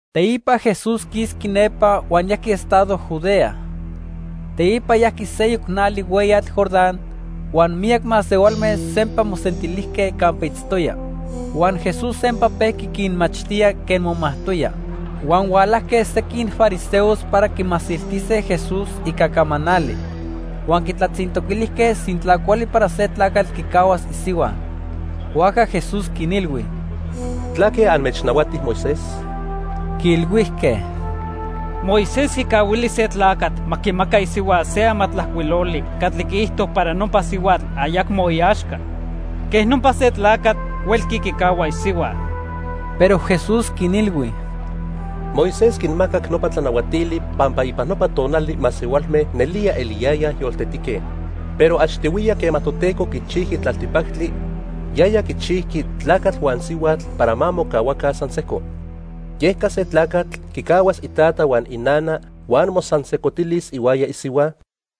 Teipa Jesús quisqui nepa huan yajqui estado Judea. Teipa yajqui seyoc nali hueyatl Jordán, huan miyac masehualme sempa mosentilijque campa itztoya. Huan Jesús sempa pejqui quinmachtía quen momajtoya. Huan hualajque sequin fariseos para quimasiltise Jesús ica camanali. Huan quitlatzintoquilijque sintla cuali para se tlacatl quicahuas isihua. Huajca Jesús quinilhui: —¿Tlaque anmechnahuati Moisés? Quiilhuijque: —Moisés quicahuili se tlacatl ma quimaca isihua se amatlajcuiloli catli quiijto para nopa sihuatl ayacmo iaxca. Quej nopa se tlacatl huelqui quicahua isihua. Pero Jesús quinilhui: —Moisés quinmacac nopa tlanahuatili pampa ipan nopa tonali masehualme nelía eliyayaj yoltetique, pero achtihuiya quema Toteco quichijqui tlaltipactli, yaya quichijqui 'tlacatl huan sihuatl para ma mocahuaca san sejco.' Yeca se tlacatl quicahuas itata huan inana huan mosansejcotilis ihuaya isihua,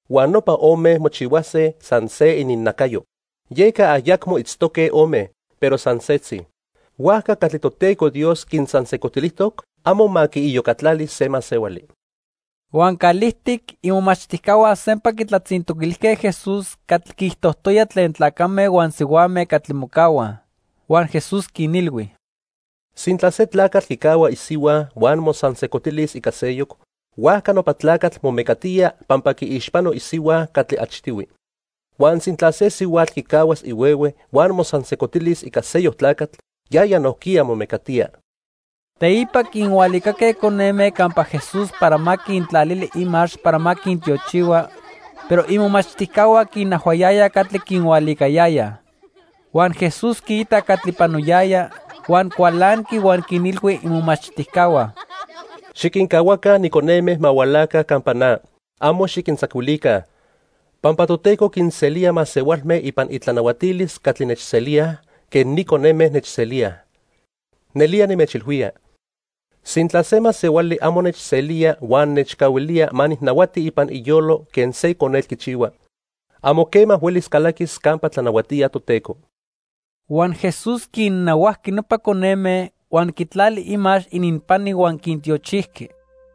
huan nopa ome mochihuase san se ininnacayo. Yeca ayacmo itztoque ome, pero san setzi. Huajca catli Toteco Dios quinsansejcotilijtoc amo ma quiiyocatlali se masehuali. Huan calijtic imomachtijcahua sempa quitlatzintoquilijque Jesús catli quiijtojtoya tlen tlacame huan sihuame catli mocahuaj. Huan Jesús quinilhui: —Sintla se tlacatl quicahua isihua huan mosansejcotilis ica seyoc, huajca nopa tlacatl momecatía pampa quiixpano isihua catli achtihui. Huan sintla se sihuatl quicahuas ihuehue huan mosansejcotilis ica seyoc tlacatl, yaya nojquiya momecatía. Teipa quinhualicaque coneme campa Jesús para ma quintlalili imax para ma quintiochihua, pero imomachtijcahua quinajhuayayaj catli quinhualicayayaj. Huan Jesús quiitac catli panoyaya, huan cualanqui huan quinilhui imomachtijcahua: —Xiquincahuaca ni coneme ma hualaca campa na. Amo xiquintzacuilica, pampa Toteco quinselía masehualme ipan itlanahuatilis catli nechselíaj quen ni coneme nechselíaj. Nelía nimechilhuía, sintla se masehuali amo nechselía huan nechcahuilía ma nijnahuati ipan iyolo quen se conetl quichihua, amo quema huelis calaquis campa tlanahuatía Toteco. Huan Jesús quinnahuajqui nopa coneme, huan quitlali imax ininpani huan quintiochijqui.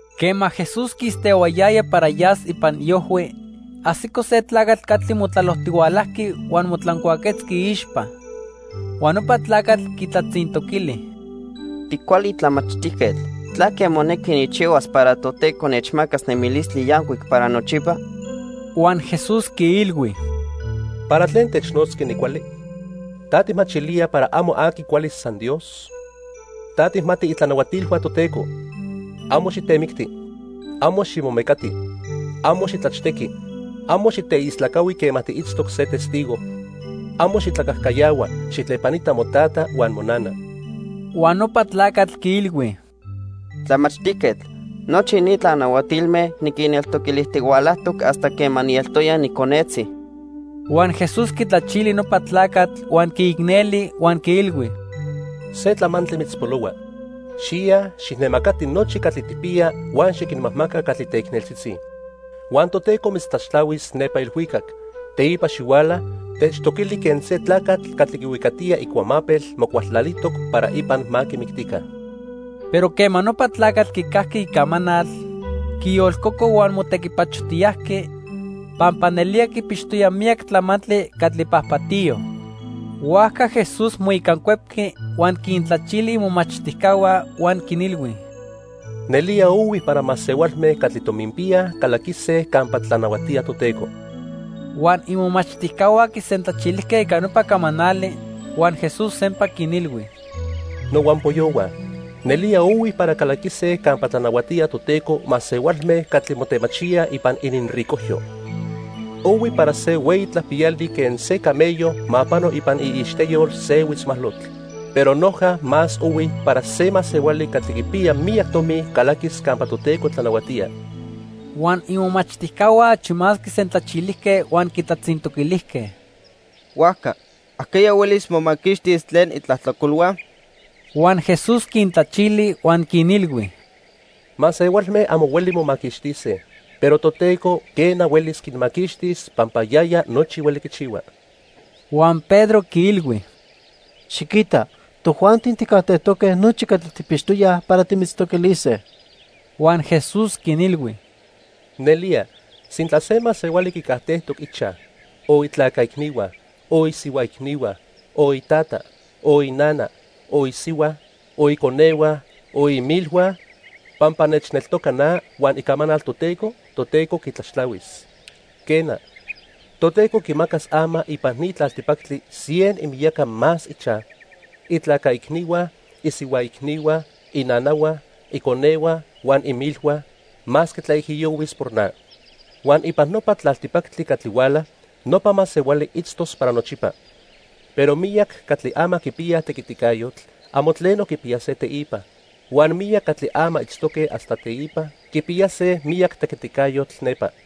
Quema Jesús quistehuayaya para yas ipan iojhui, ajsico se tlacatl catli motlalojtihualajqui huan motlancuaquetzqui iixpa. Huan nopa tlacatl quitlatzintoquili: —Ticuali tlamachtijquetl, ¿tlaque monequi nijchihuas para Toteco nechmacas nemilistli yancuic para nochipa? Huan Jesús quiilhui: —¿Para tlen technotzqui nicuali? ¿Ta tijmachilía para amo aqui cuali, san Dios? Ta tijmati itlanahuatilhua Toteco: 'Amo xitemicti; amo ximomecati; amo xitlachtequi; amo xiteistlacahui quema tiitztoc se testigo; amo xitlacajcayahua; xijtlepanita motata huan monana.' Huan nopa tlacatl quiilhui: —Tlamachtijquetl, nochi ni tlanahuatilme niquinneltoquilijtihualajtoc hasta quema nieltoya niconetzi. Huan Jesús quitlachili nopa tlacatl huan quiicneli; huan quiilhui: —Se tlamantli mitzpolohua. Xiya, xijnemacati nochi catli tijpiya huan xiquinmajmaca catli teicneltzitzi. Huan Toteco mitztlaxtlahuis nepa ilhuicac. Teipa xihuala, techtoquili quen se tlacatl catli quihuicatiya icuamapel mocualtlalijtoc para ipan ma quimictica. Pero quema nopa tlacatl quicajqui icamanal, quiyolcoco huan motequipachojtiyajqui, pampa nelía quipixtoya miyac tlamantli catli pajpatiyo. Huajca Jesús moicancuepqui huan quintlachili imomachtijcahua huan quinilhui: —¡Nelía ohui para masehualme catli tominpiyaj calaquise campa tlanahuatía Toteco! Huan imomachtijcahua quisentlachilijque ica nopa camanali. Huan Jesús sempa quinilhui: —Nohuampoyohua, nelía ohui para calaquise campa tlanahuatía Toteco masehualme catli motemachíaj ipan ininricojyo. Ohui para se hueyi tlapiyali quen se camello ma pano ipan iixteyol se huitzmalotl, pero noja más ohui para se masehuali catli quipiya miyac tomi calaquis campa Toteco tlanahuatía. Huan imomachtijcahua achi más quisentlachilijque huan quitlatzintoquilijque: —Huajca ¿ajqueya huelis momaquixtis tlen itlajtlacolhua? Huan Jesús quintlachili huan quinilhui: —Masehualme amo hueli momaquixtise, pero Toteco, quena, huelis quinmaquixtis pampa yaya nochi hueli quichihua. Huan Pedro quiilhui: —Xiquita, tojuanti tijcajtejtoque nochi catli tijpixtoyaj para timitztoquilise. Huan Jesús quinilhui: —Nelía, sintla se masehuali quicajtejtoc ichaj, o itlaca icnihua, o isihua icnihua, o itata, o inana, o isihua, o iconehua, o imilhua, pampa nechneltoca na huan icamanal Toteco, Toteco quitlaxtlahuis. Quena, Toteco quimacas ama ipan ni tlaltipactli cien imiyaca más ichaj, itlaca icnihua, isihua icnihua, inanahua, iconehua huan imilhua, masque tlaijiyohuis por na. Huan ipan nopa tlaltipactli catli huala, nopa masehuali itztos para nochipa. Pero miyac catli ama quipiyaj tequiticayotl, amo tleno quipiyase teipa; huan miyac catli ama itztoque hasta teipa, quipiyase miyac tequiticayotl nepa.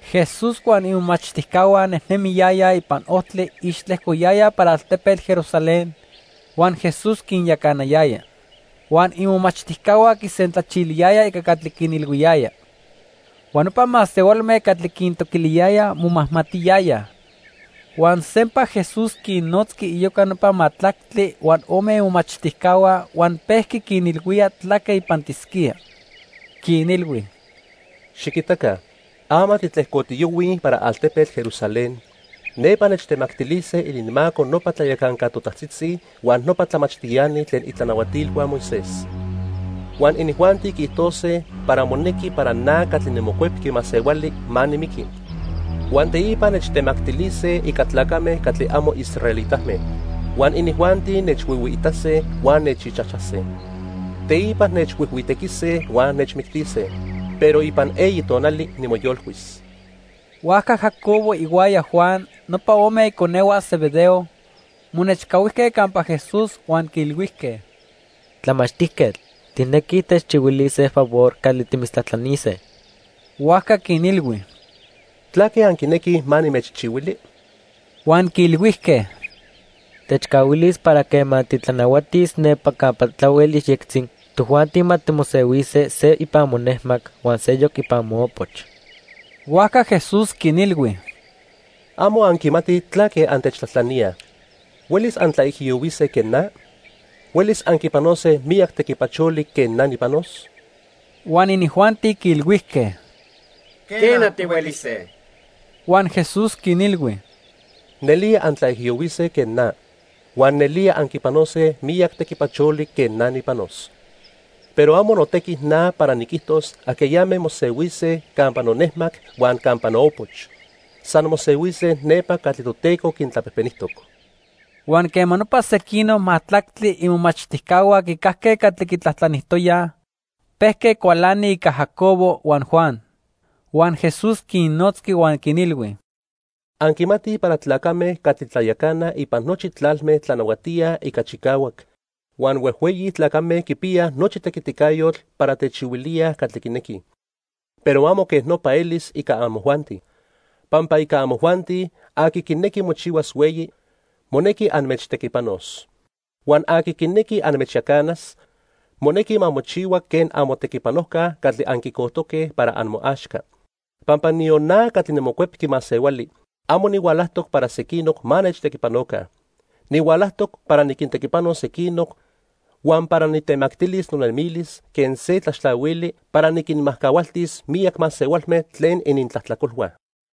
Jesús huan imomachtijcahua nejnemiyayaj ipan ojtli ixtlejcoyayaj para altepetl Jerusalén huan Jesús quinyacanayaya. Huan imomachtijcahua quisentlachiliyayaj ica catli quinilhuiyaya. Huan nopa masehualme catli quintoquiliyayaj momajmatiyayaj. Huan sempa Jesús quinnotzqui iyoca nopa majtlactli huan ome imomachtijcahua huan pejqui quinilhuía tlaque ipantisquía. Quinilhui: "Xiquitaca, ama titlejcotiyohuij para altepetl Jerusalén. Nepa nechtemactilise ininmaco nopa tlayacanca totajtzitzi huan nopa tlamachtiani tlen itlanahuatilhua Moisés. Huan inijuanti quiijtose para monequi para na catli niMocuepqui Masehuali ma nimiqui, huan teipa nechtemactilise ica tlacame catli amo israelitame. Huan inijuanti nechhuihuiitase huan nechixchijchase. Teipa nechhuijhuitequise huan nechmictise. Pero ipan eyi tonali, nimoyolcuis." Huajca Jacobo ihuaya Juan, nopa ome iconehua Zebedeo, monechcahuijque campa Jesús huan quiilhuijque: —Tlamachtijquetl, tijnequij techchihuilis se favor catli timitztlajtlanise. Huajca quinilhui: —¿Tlaque anquinequij ma nimechchihuili? Huan quiilhuijque: —Techcahuilis para quema titlanahuatis nepa campa tlahuel yejyectzi, tojuanti ma timosehuise se ipan monejmac huan seyoc ipan moopoch. Huajca Jesús quinilhui: —Amo anquimatij tlaque antechtlajtlaníaj. ¿Huelis antlaijiyohuise quen na? ¿Huelis anquipanose miyac tequipacholi quen na nijpanos? Huan inijuanti quiilhuijque: —Quena, tihuelise. Huan Jesús quinilhui: —Nelía antlaijiyohuise quen na. Huan nelía anquipanose miyac tequipacholi quen na nijpanos. Pero amo notequi na para niquijtos ajqueyame mosehuise campa nonejmac huan campa noopoch. San mosehuise nepa catli Toteco quintlapejpenijtoc. Huan quema nopa sequinoc majtlactli imomachtijcahua quicajque catli quitlajtlanijtoyaj, pejque cualanij ica Jacobo huan Juan. Huan Jesús quinnotzqui huan quinilhui: —Anquimatij para tlacame catli tlayacanaj ipan nochi tlalme tlanahuatíaj ica chicahuac, huan huejhueyi tlacame quipiyaj nochi tequiticayotl para techihuilíaj catli quinequij. Pero amo quej nopa elis ica amojuanti. Pampa ica amojuanti, aqui quinequi mochihuas hueyi, monequi anmechtequipanos. Huan aqui quinequi anmechyacanas, monequi ma mochihua quen amotequipanojca catli anquicojtoque para amoaxca. Pampa niyon na catli niMocuepqui Masehuali, amo nihualajtoc para sequinoc ma nechtequipanoca. Nihualajtoc para niquintequipanos sequinoc, huan para nitemactilis nonemilis quen se tlaxtlahuili para niquinmajcahualtis miyac masehualme tlen inintlajtlacolhua.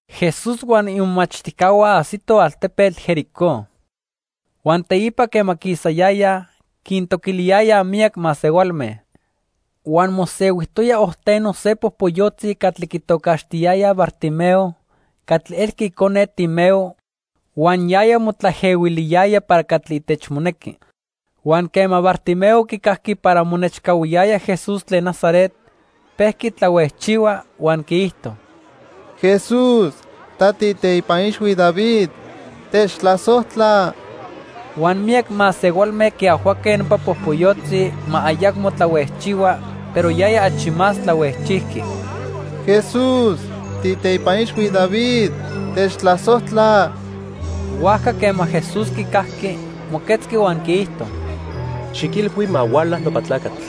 Jesús huan imomachtijcahua ajsitoj altepetl Jericó. Huan teipa quema quisayayaj, quintoquiliyayaj miyac masehualme. Huan mosehuijtoya ojteno se popoyotzi catli quitocaxtiyayaj Bartimeo catli elqui icone Timeo huan yaya motlaejehuiliyaya para catli itechmonequi. Huan quema Bartimeo quicajqui para monechcahuiyaya Jesús tlen Nazaret, pejqui tlahuejchihua huan quiijto: —¡Jesús, ta tiiteipa ixhui David, techtlasojtla! Huan miyac masehualme quiajhuaque nopa popoyotzi ma ayacmo tlahuejchihua, pero yaya achi más tlahuejchijqui: —¡Jesús, tiiteipa ixhui David, techtlasojtla! Huajca quema Jesús quicajqui, moquetzqui huan quiijto: —Xiquilhui ma huala nopa tlacatl.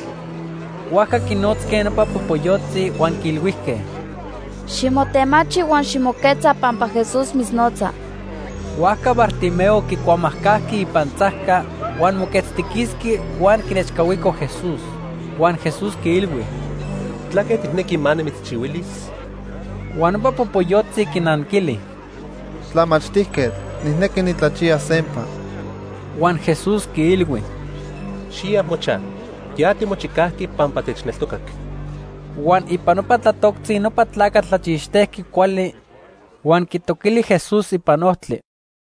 Huajca quinotzque nopa popoyotzi huan quiilhuijque: —Ximotemachi huan ximoquetza pampa Jesús mitznotza. Huajca Bartimeo quicuamajcajqui ipantzajca, huan moquetztiquisqui huan quinechcahuico Jesús. Huan Jesús quiilhui: —¿Tlaque tijnequi ma nimitzchihuilis? Huan nopa popoyotzi quinanquili: —Tlamachtijquetl, nijnequi nitlachiyas sempa. Huan Jesús quiilhui: —Xiya mochaj, ya timochicajqui pampa techneltocac. Huan ipan nopa tlatoctzi nopa tlacatl tlachixtejqui cuali, huan quitoquili Jesús ipan ojtli.